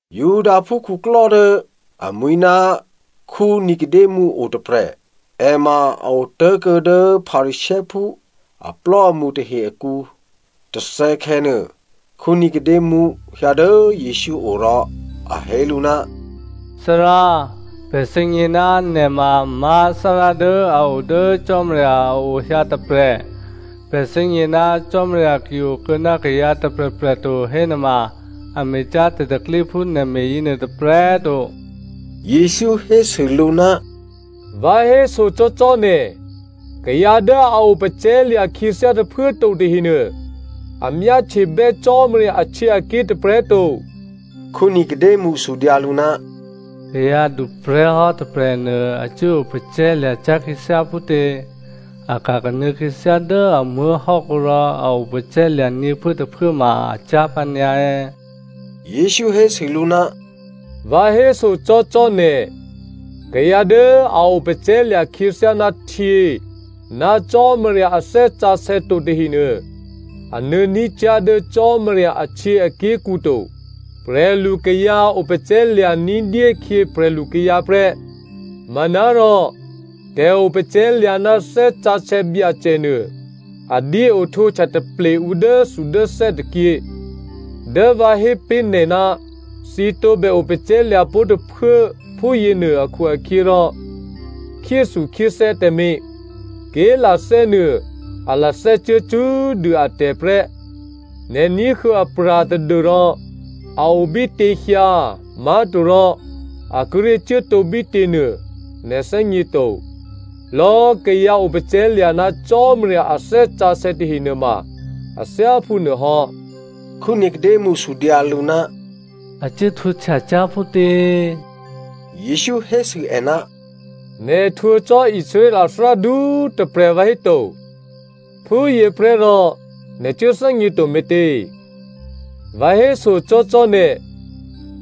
Judaphú khuklò́ dố amwi̤ ná Nicodemo o tôprè̤. È ma a otố̤kuô̌ dố Pharisěophú aplò́amṳ tahe akǔ. Tôthè̌khè̌nuô Nicodemo hyǎ dố Jesǔ o rò a hé lǔ, “Thárá, pè̤ thè́gně ná nè̤ ma má̤ Thárá dố a o dố Cò́marya a ohyǎ tôprè̤. Pè̤ thè́gně ná Cò́marya ki okuô̌ ná kayǎ tôprè̤prè̤ to hénuôma a me̤cyá̤ tè̤pro̤tè̤prya̤ phú nè̤ me̤ yěnuô tôprè̤꤮ to.” Jesǔ hésû lǔ, “Vǎ hésocò́cò́ nè̤, kayǎ dố a opacè̤̌lya̤ khyěthyá tôphuố꤮ to tahenuô, a myáhtyebè́ Cò́marya ahtyěaké̤ tôprè̤꤮ to.” Nicodemo sudyǎ lǔ, “Kayǎ duprè̤́hò́ tôprè̤nuô a cuố opacè̤̌lya̤ cyá̤ khyěthyá phútě? A ka̤ kanuô̌ khyěthyá dố a muố̤hò́kǔ rò a opacè̤̌lya̤ nyě̤phuốtôphuố ma a cyá̤ pǎnyǎ è̌?” Jesǔ hésû lǔ, “Vǎ hésocò́cò́ nè̤, kayǎ dố a opacè̤̌lya̤ khyěthyá ná htyě ná Cò́marya a Thè́ Sǎsè̌ to tahenuô a nuô̌ní̤ cyá̤ dố Cò́marya ahtyěaké̤kǔ to. Prè̤lu kayǎ opacè̤̌lya̤ ní̤dyé khyě prè̤lu kayǎ prè́. Manárò tè̤opacè̤̌lya̤ ná Thè́ Sǎsè̌ Byacè nuô, a dyé ohtwǒhtya taple ǔ dốthudốthè́ tôkyě. Dố vǎ hé pé̤ nè̤, ‘Thǐ tǒbè opacè̤̌lya̤ pó̤ tôphuố,’ phúyěnuô akhu-akhyěrò, khyéthukhyéthè́ tǎmé̤. Ké̤lathè́ nuô a lathè́cuố cṳ́꤮ dû atè̤ prè́. Nè̤ ní̤huô̌ apra̤ tadû́rò a o bítěhyǎ má̤torò a kíré̤ cuốtǒ bítě nuô nè̤ thè́gněto. Lò̌꤮ kayǎ opacè̤̌lya̤ ná Cò́marya a Thè́ Sǎsè̌ tahe nuôma a thyáphú nuôhò́.” Nicodemo sudyǎ lǔ, “A cuố htwǒhtya cyá̤ phútě?” Jesǔ hésû è, “Nè̤ htwǒ cò́ Israel a thárádu꤮ tôprè̤ vǎhéto, phúyěprè́ rò nè̤ cuố thè́gněto me̤tě? Vǎ hésocò́cò́ nè̤,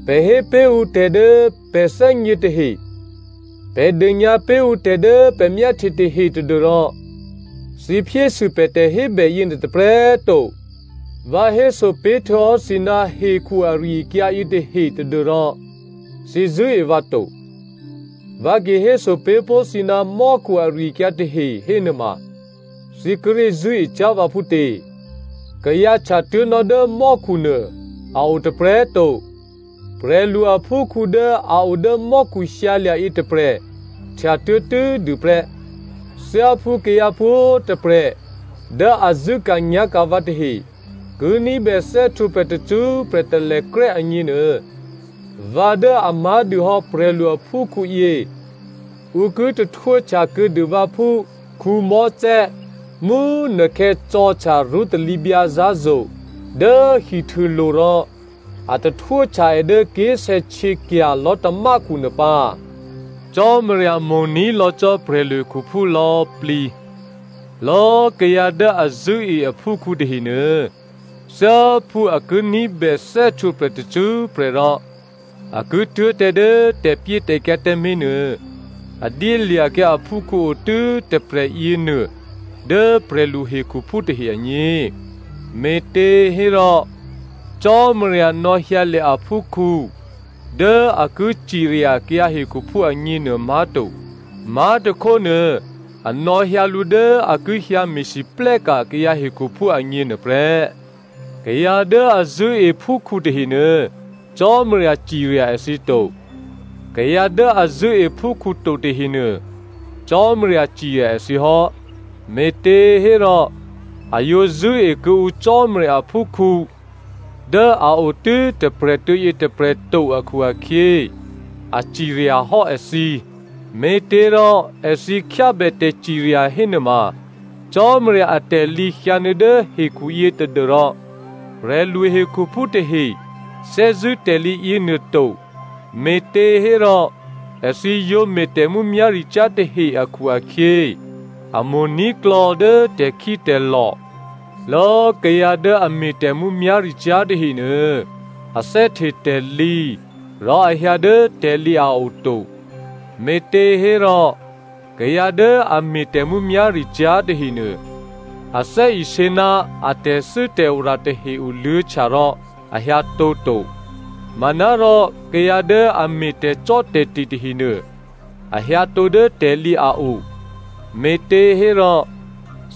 pè̤ hé pé̤ ǔ tè̤ dố pè̤ thè́gně tahe, pè̤ dônyǎ pé̤ ǔ tè̤ dố pè̤ myáhtye tahe tadû́rò thǐ phyésû pè̤ tè̤hébè yěnuô tôprè̤꤮ to. Vǎ héso pé̤htuô̌hò́ thǐ ná hekhu ari-akyǎ yětahe tadû́rò thǐ zṳ̂́e vǎ to. Vǎ ki héso pé̤ pó̤ thǐ ná mò́khu ari-akyǎ tahe hénuôma thǐ kíré̤ zṳ̂́e cyá̤ vǎ phútě? Kayǎ htyatuố̤nò́ dố mò́khu nuô a o tôprè̤꤮ to. Prè̤lu aphúkhǔ dố a o dố mò́khu hyǎlya̤ yětôprè̤ htyatuố̤ tû́꤮ dû prè́. Thyáphú kayǎ pwǒ̤꤮ tôprè̤ dố a zṳ̂́ka̤nyá̤ka̤ vǎ tahe, ki ní̤bè thè́htwǒprè̤ tacṳ́prè̤ talèkrè́ agněnuô, vǎ dố a má̤dûhò́ prè̤lu aphúkhǔ yě ǔ ki tahtwóhtya kuô̌dû vǎ phú Mosè mú꤮ nukhè̌ cò̤̌htya rṳ́talǐbyǎ zǎ̤zo̤ dố hihtûlo̤ rò a tahtwóhtya è dố ké̤sè̌htyěkya̤ lò̤́tamákhu nuô pǎ. “Cò́marya mo̤ní̤ lò̌ cò́ prè̤lu hekhuphú lò̌꤮ plǐ. Lò̌꤮ kayǎ dố a zṳ̂́e aphúkhǔ tahenuô, thyáphú a ki ní̤bè thè́htwǒprè̤ tacṳ́prè̤ rò a ki tuố̤ tǎ dố tè̤pyétè̤kyǎ tǎmé̤ nuô, a dyélya̤kyǎ aphúkhǔ o tû́ tôprè̤ yěnuô dố prè̤lu hekhuphú tahe agně. Me̤těhérò, Cò́marya nò̌hyǎlya̤ aphúkhǔ dố a ki cirya kayǎ hekhuphú agněnuô má̤to. Má̤tôkhónuô a nò̌hyǎ lǔ dố a ki hyǎ me̤lwóhteka̤ kayǎ hekhuphú agně nuôprè́. Kayǎ dố a zṳ̂́e phúkhǔ tahenuô, Cò́marya cirya èthǐ to. Kayǎ dố a zṳ̂́e phúkhǔ to tahenuô, Cò́marya cirya èthǐ hò́, me̤těhérò, a yǒ zṳ̂́e kuô̌ǔ Cò́marya aphúkhǔ dố a o tû́ tôprè̤꤮ tuô̌ yětôprè̤ to akhu-akhyě, a ciryahò́ èthǐ. Me̤těrò èthǐ khyábè tè̤cirya hénuôma, Cò́marya atè̤lǐ hyǎnuô̌ dố hekhuyě tadû́rò prè̤lu hekhuphú tahe thè́zṳ̂́ tè̤lǐ yěnuô to me̤těhérò èthǐ yǒ me̤ tè̤mǔmyá̤ricyá̤ tahe akhu-akhyě, a mo̤ní̤klò̌ dố tè̤khítè̤lò̤. Lò̌꤮ kayǎ dố a me̤ tè̤mǔmyá̤ricyá̤ tahenuô, a thè́hte tè̤lǐ rò a hyǎ dố tè̤lǐ a o to, me̤těhérò kayǎ dố a me̤ tè̤mǔmyá̤ricyá̤ tahenuô, a thè́isě ná a tè̤thû́tè̤ora tahe oluô̌htya rò a hyǎtǒ to. Manárò kayǎ dố a me̤ tè̤cò́tè̤te̤ tahenuô, a hyǎtǒ dố tè̤lǐ a o, me̤těhérò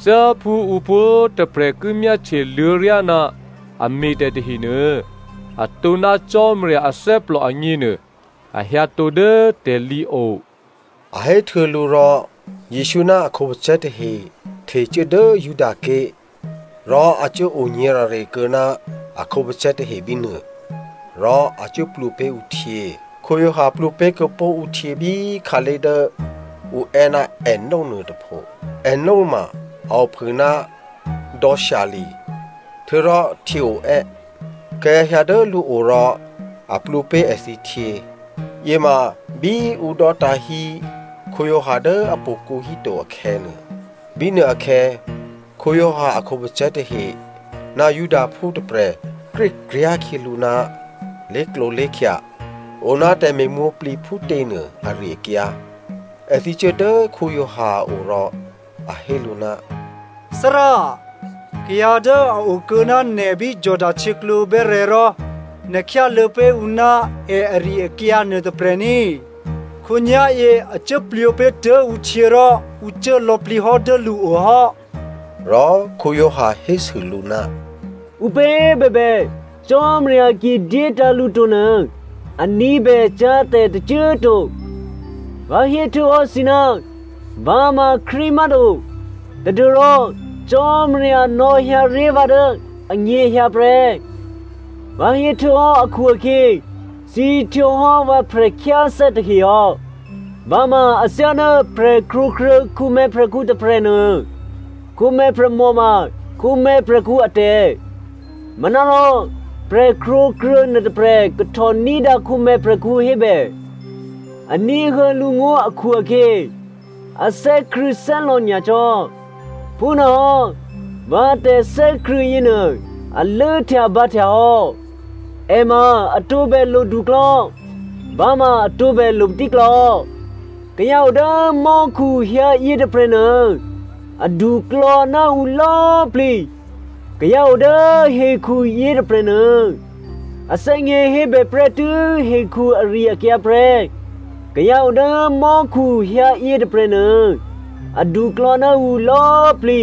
thyáphú ǔ pwǒ̤꤮ tôprè̤ ki myáhtye luô̌ryá ná a me̤tè̤ tahenuô, atǒ ná Cò́marya athè́plò agněnuô, a hyǎtǒ dố tè̤lǐ o.” A héhtuô̌ lǔ rò, Jesǔ ná a khǒpacè̤̌ tahe htecuố dố Judaké̤. Rò a cuốo nyě̤rare kuô̌ ná a khǒpacè̤̌ tahe bínuô rò a cuốplwǒ pé̤ ǔ htyě. Giovanni plwǒ pé̤ kuô̌pó̤ ǔ htyě bí khǎlé̤ dố ǔ è́ ná Aenon nuôtôpho. Aenon ma a ophû ná dò̌ Salim htuô̌rò htyě oè́. Kayǎ hyǎ dố lǔo rò a plwǒ pé̤ èthǐ htyě. (Yěma bí ǔ dò́tǎ̤ hí Giovanni dố htò̌kǔ híto akhè̌nuô) bínuôakhè̌ Giovanni a khǒpacè̤̌ tahe ná Judaphú tôprè̤ krékryá̤ khyělǔ ná lé̤klǒlé̤khya oná tè̤me̤mwǒ̤plǐ phútě nuô ari-akyǎ. Èthǐ cuố dố Giovanni a o rò a hé lǔ, “Thárá꤮ kayǎ dố a okuô̌ ná nè̤ bí Jordano htyěklǒ bè́rè̤̌ rò nè̤ khyáluô̌ pé̤ ǔ ná è ari-akyǎ nuôtôprè̤ ní꤮ khǒnyá̤yě a cuốplwǒ pé̤tuố̤ ǔ htyě rò ǔ cuố lò̌plǐ hò́ dố lǔo hò́.” Rò Giovanni hésû lǔ, “Ǔpě bèbè Cò́marya ki dyétǎ̤ lǔ to nuô, a ní̤bè cyá̤ tè̤ tôcô꤮ to. Vǎ héhtuô̌hò́ thǐ, ‘Vǎ ma Krístu má̤to tadû́rò Cò́marya nò̌hyǎ ré̤ vǎ dố ènyěhyǎ prè́.’ Vǎ héhtuô̌hò́ akhu-akhyě thǐ htwǒhò́ vǎ prè̤khyáthè́ tahe hò́. Vǎ ma athyáná prè̤krwǒkruô̌ khǒmè̤̌ prè̤khǔ tôprè̤nuô. Khǒmè̤̌ prè̤mò ma khǒmè̤̌ prè̤khǔ atè̤. Manárò prè̤krwǒkruô̌ nuôtôprè̤ kahtò ní̤dǎ khǒmè̤̌ prè̤khǔ hébè. A ní̤huô̌ lǔngó̤ akhu-akhyě, a thè́krṳ̂̌thè́lò̌ nyacò́. Phúnuôhò́ vǎ tè̤thè́krṳ̂̌ yěnuô a lốhtyabǎhtya hò́. È ma a tǒbè loduklò̌, vǎ ma a tǒbè lo patíklò̌. “Kayǎ o dố mò́khu hyǎ yětôprè̤nuô, aduklò̌ ná ǔ lò̌꤮ plǐ. Kayǎ o dố hekhu yětôprè̤nuô a thè́gně hébè prè́tû́ hekhu ari-akyǎ prè́. Kayǎ o dố mò́khu hyǎ yětôprè̤nuô aduklò̌ ná ǔ lò̌꤮ plǐ.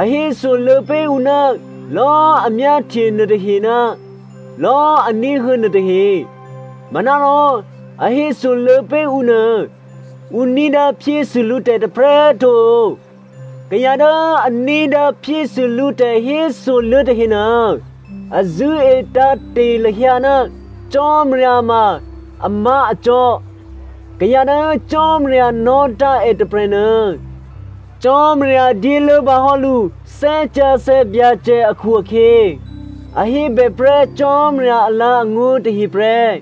A hésoluô̌ pé̤ ǔ ná lò̌꤮ a myáhtye nuôtahe ná lò̌꤮ a ní̤huô̌ nuôtahe. Manárò a hésoluô̌ pé̤ ǔ nuô ǔ ní̤dǎ phyésû lǔtè̤ tôprè̤꤮ to. Kayǎ dố a ní̤dǎ phyésû lǔ tè̤hésoluô̌ tahenuô a zṳ̂́e tǎ̤te̤ lahyǎ ná Cò́marya ma amá̤acò́. Kayǎ dố Cò́marya nò̌tǎ̤ è tôprè̤nuô, Cò́marya dyé lốbǎ hò́ lǔ Thè́ Sǎsè̌ Byacè akhu-akhyě, a hébèprè́ Cò́marya alǎ̤angó̤ tahe prè́.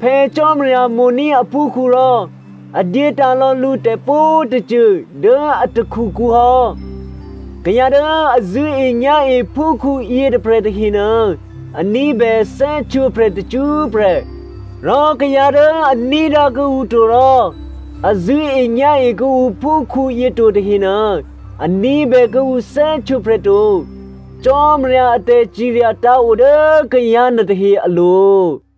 Phè̌ Cò́marya mo̤ní̤ aphúkhǔ rò a dyétǎ̤lò̌ lǔ tè̤pwǒ̤꤮ tôcô dố a takhukǔ hò́. Kayǎ dố a zṳ̂́enyá̤e phúkhǔ yětôprè̤ tahenuô, a ní̤bè thè́htwǒprè̤ tacṳ́prè̤. Rò kayǎ dố a ní̤dǎ kuô̌ǔ to rò a zṳ̂́enyá̤e kuô̌ǔ phúkhǔyě to tahenuô, a ní̤bè kuô̌ǔ thè́htwǒprè̤ to. Cò́marya a tè̤cirya tǎ̤ o dố kayǎ nuôtahe alo̤.”